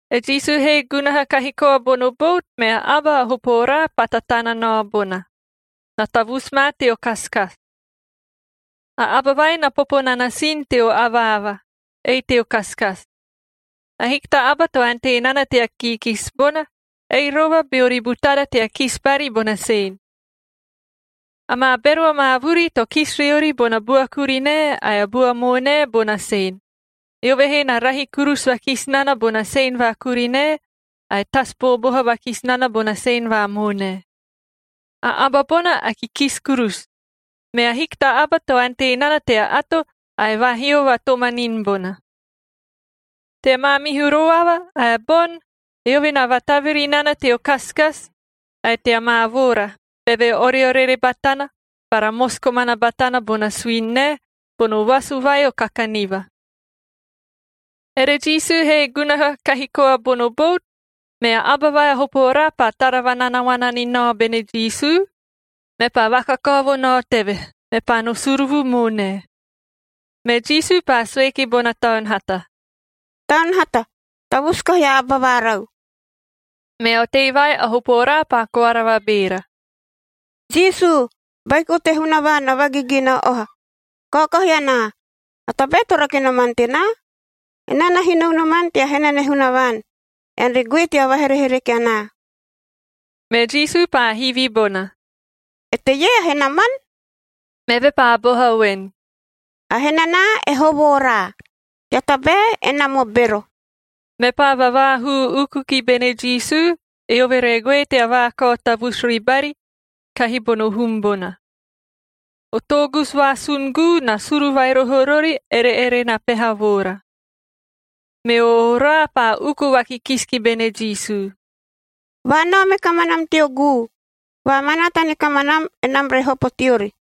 E Jisu he gunaha kahi koa bono bout, mea a aba a hopo oraa paa tatana nao bona. Na tavusu ma teo kasikasi. A aba vai na popo nana sin teo avaava, ei teo kasikasi. Ahiki ta aba to ante nana tea kiikisi bona, ei rova beori butara tea kisi bari bona sen. Amaa bero amaa vuri to kisi riori bona bua kurinae ae a bua moonae bona sen, eove he na rahi kurusu vakisi nana bona sen va kurinae ae tasu booboha vakisi nana bona sen va moonae. A aba bona a kikisi kurusu, me ahiki ta aba to ante nana tea ato ae vaahio vatomanini bona. Tea maamihu roava ae boni, eove na vataviri nana teo kasikasi ae tea maa voora, beve oreorere batana bara mosi komana batana bona suini nae bono vasu vai o kakaniva. Ere Jisu he gunaha kahi koa bono bout, mea aba vai a hopo oraa paa tara vananaoana ni nao bene Jisu, mepaa vakakao vo nao teve, mepaa no suruvu moonae. Me Jisu paa sue ki bona taun hata, “Taun hata, tavusu kahi a aba vaarau!” Mea otei vai a hopo oraa paa koara vabeera, “Jisu, Baiko te Hunavaan a Vagigina Oha, kaokahi anaa! A tabae to rake noman tenaa? Enaa na hino unoman tea henane Hunavaan, ean re goe tea vaherehereke anaa.” Me Jisu paa hivi bona, “Eteie a henaman?” Meve paa boha voen, “A henanaa e Hovo-oraa,b tea tabae enam o bero.” Mepaa vavaahuu uku ki bene Jisu, eove re goe tea vaakao tavusu ribari kahi bono hum bona. O toogusu vaasun guu na suru vai roho rori ere-ere na peha voora. Meo oraa paa uku vakikisi ki bene Jisu, “Vaanao me kamanam teo guu, vaamanaata ni kamanam, enam re hopo teori.”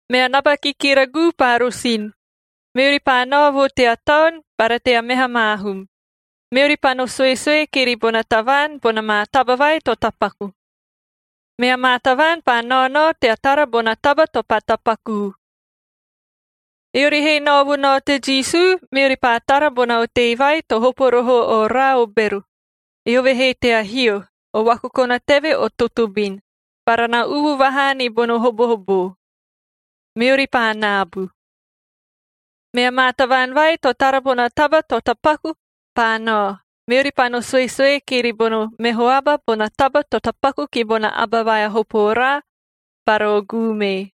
Mea naba kikira guu paa rosin, meori paa nao vo tea taon bara tea meha maa hum, meori paa no suesue kiri bona tavaan bona maa taba vai to tapaku. Mea maa tavaan paa naonao tea tara bona taba to paa tapakuu. Eori he nao vo nao te Jisu, meori paa tara bona otei vai to hopo roho o oraa o bero, eove he tea hio, o vakokona teve o totobin, bara na uvu vahaa ni bono hobohoboo. Meori paa naabu. Mea maa tavaan vai to tara bona taba to tapaku paa nao, meori paa no suesue kiri bono meho aba bona taba to tapaku ki bona aba vai a hopo oraa bara o guu mee.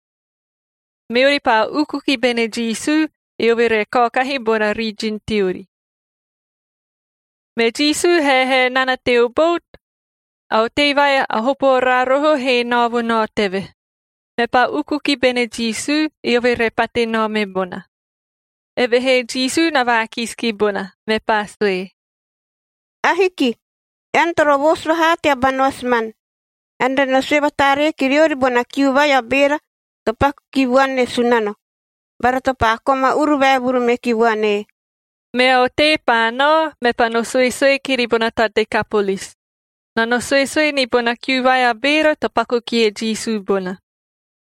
Meori paa uku ki bene Jisu, eve re kaokahi bona rijin teori. Me Jisu haehae nana teo bout, a otei vai a hopo oraa roho he nao vo nao teve, mepaa uku ki bene Jisu, eove re pate nao me bona. Evehee Jisu na vaakisi ki bona, mepaa sue, “Ahiki. Ean toro voosu vahaa tea ba noasiman. Ean re no sue vataaree ki riori bona kiu vai a beera to paku ki vuan e Sunano, bara to paa koma uru vaevuru meki vuan ee.” Mea otei paa nao, mepaa no suesue kiri bona ta Dekapolis.c Na no suesue ni bona kiu vai a beera to paku kie Jisu bona.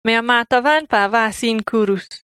Mea maa tavaan paa vaasin kurusu.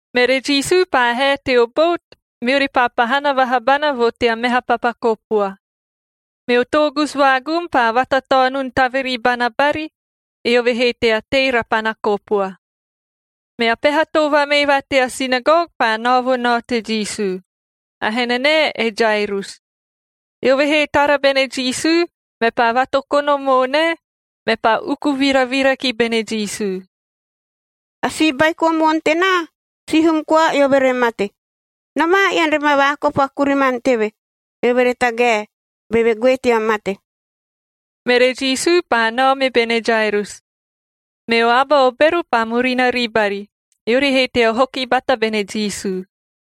Mere Jisu paa hae teo bout, meori paa pahana vaha bana vo tea meha papa kopua. Meo toogusu vaagum paa vatataonun taviri bana bari, eove he tea tei rapana kopua. Mea peha too vamee va tea sinagog paa nao vo nao te Jisu. A henanae e Jairus. Eove he tara bene Jisu, mepaa vatokono moonae, mepaa uku viravira ki bene Jisu, “A si baiko moon tenaa, sihum koa eove re mate. Nomaa ean re ma vaakopo a kuriman teve, eove re tagae, beve goe tea mate.” Mere Jisu paa nao me bene Jairus, meo aba o bero paa murina ribari, eori he tea hoki bata bene Jisu.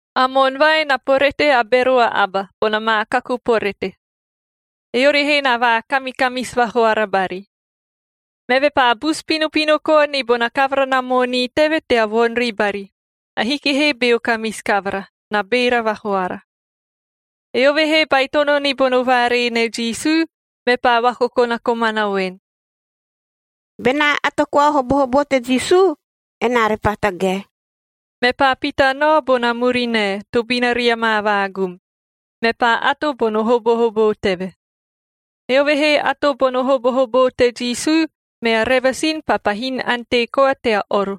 A moon vai na porete a bero a aba, bona maa kaku porete. Eori he na vaakamikamisi vahoara bari. Meve paa busu pinopino koa ni bona kavara na moonii teve tea voni ribari, ahiki he beo kamisi kavara, na beera vahoara. Eove he baitono ni bono vaaree ne Jisu, mepaa vakokona komana voen, “Benaa ato koa o hobohoboo te Jisu, enaa repaa tagae.” Mepaa pita nao bona murinae, tobina ria maa vaagum, mepaa ato bono hobohoboo teve. Eove he ato bono hobohoboo te Jisu, mea revasin paa pahin ante koa tea oro.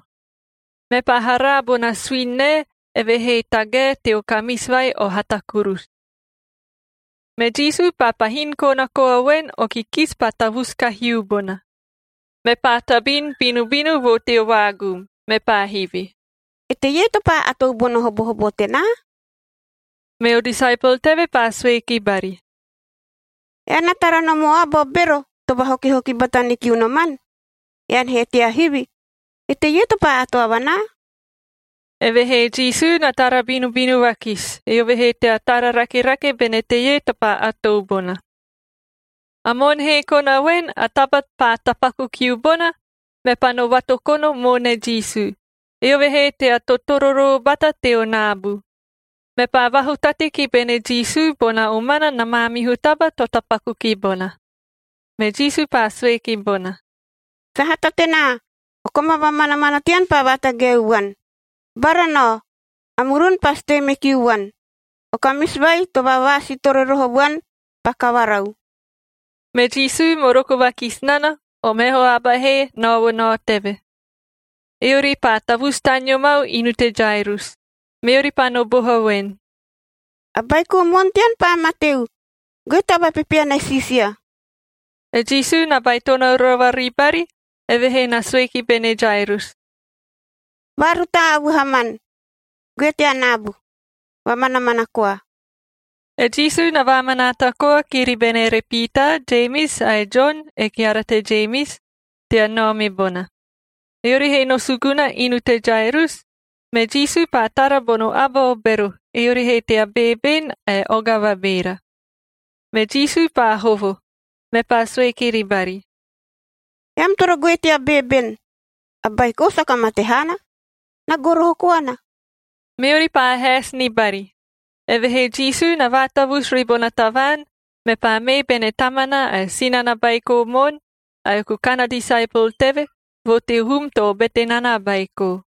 Mepaa haraa bona suini nae eve he tagae teo kamisi vai o hata kurusu. Me Jisu paa pahin kona koa voen o kikisi paa tavusu kahiu bona. Mepaa tabin binubinu vo teo vaagum, mepaa hivi, “Eteie to paa atou bono hobohoboo tenaa?” Meo disaepol teve paa sue ki bari, “Ean na tara nom o aba o bero to vahokihoki bata ni kiu noman, ean he tea hivi, ‘Eteie to paa ato avanaa?’” Evehee Jisu na tara binubinu vakisi, eove he tea tara rakerake bene teie to paa atou bona. A moon he kona voen a taba paa tapaku kiu bona, mepaa no vatokono moone Jisu, eove he tea totororoo bata teo naabu,d mepaa vahutate ki bene Jisu bona omana na maamihu taba to tapaku ki bona. Me Jisu paa sue ki bona, “Sahata tenaa! O koma vamanamana tean paa vatagaeu vuan. Bara, nao. A murun pasi tei me kiu vuan. O kamisi vai to vavaasiitore roho vuan paa kavarau.” Me Jisu moroko vakisi nana, o meho aba he nao vo nao teve. Eori paa tavusu taneo mau inu te Jairus. Meori paa no boha voen, “A baiko moon tean paa mateu, goe tea vapepeana e Siisia.” E Jisu na baitono rova ribari, evehee na sue ki bene Jairus, “Vaarutaa a vuhaman, goe tea naabu, vamanamana koa.” E Jisu na vaamanaata koa kiri bene ere Piitaa, Jemis ae Jon e keara te Jemis tea nao me bona. Eori he no suguna inu te Jairus, me Jisu paa tara bono aba o bero eori he tea beeben ae oga vabeera. Me Jisu paa hovo, mepaa sue kiri bari, “Eam toro goe tea beeben! A baiko saka mate haana, na goroho koana.” Meori paa haesi ni bari, evehee Jisu na vaatavusu ribona tavaan, mepaa mee bene tamana ae sinana baiko moon, ae a kukan a disaepol teve vo teo hum to obete nana a baiko.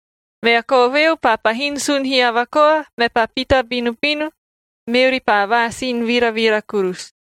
Mea koveu paa pahin sun hiava koa, mepaa pita binubinu, meori paa vaasin viravira kurusu.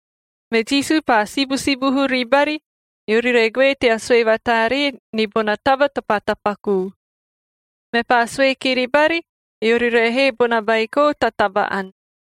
Me Jisu paa sibusibuhu ribari, eori re goe tea sue vataaree ni bona taba to paa tapakuu. Mepaa sue kiri bari, eori re hee bona baiko ta taba-ani.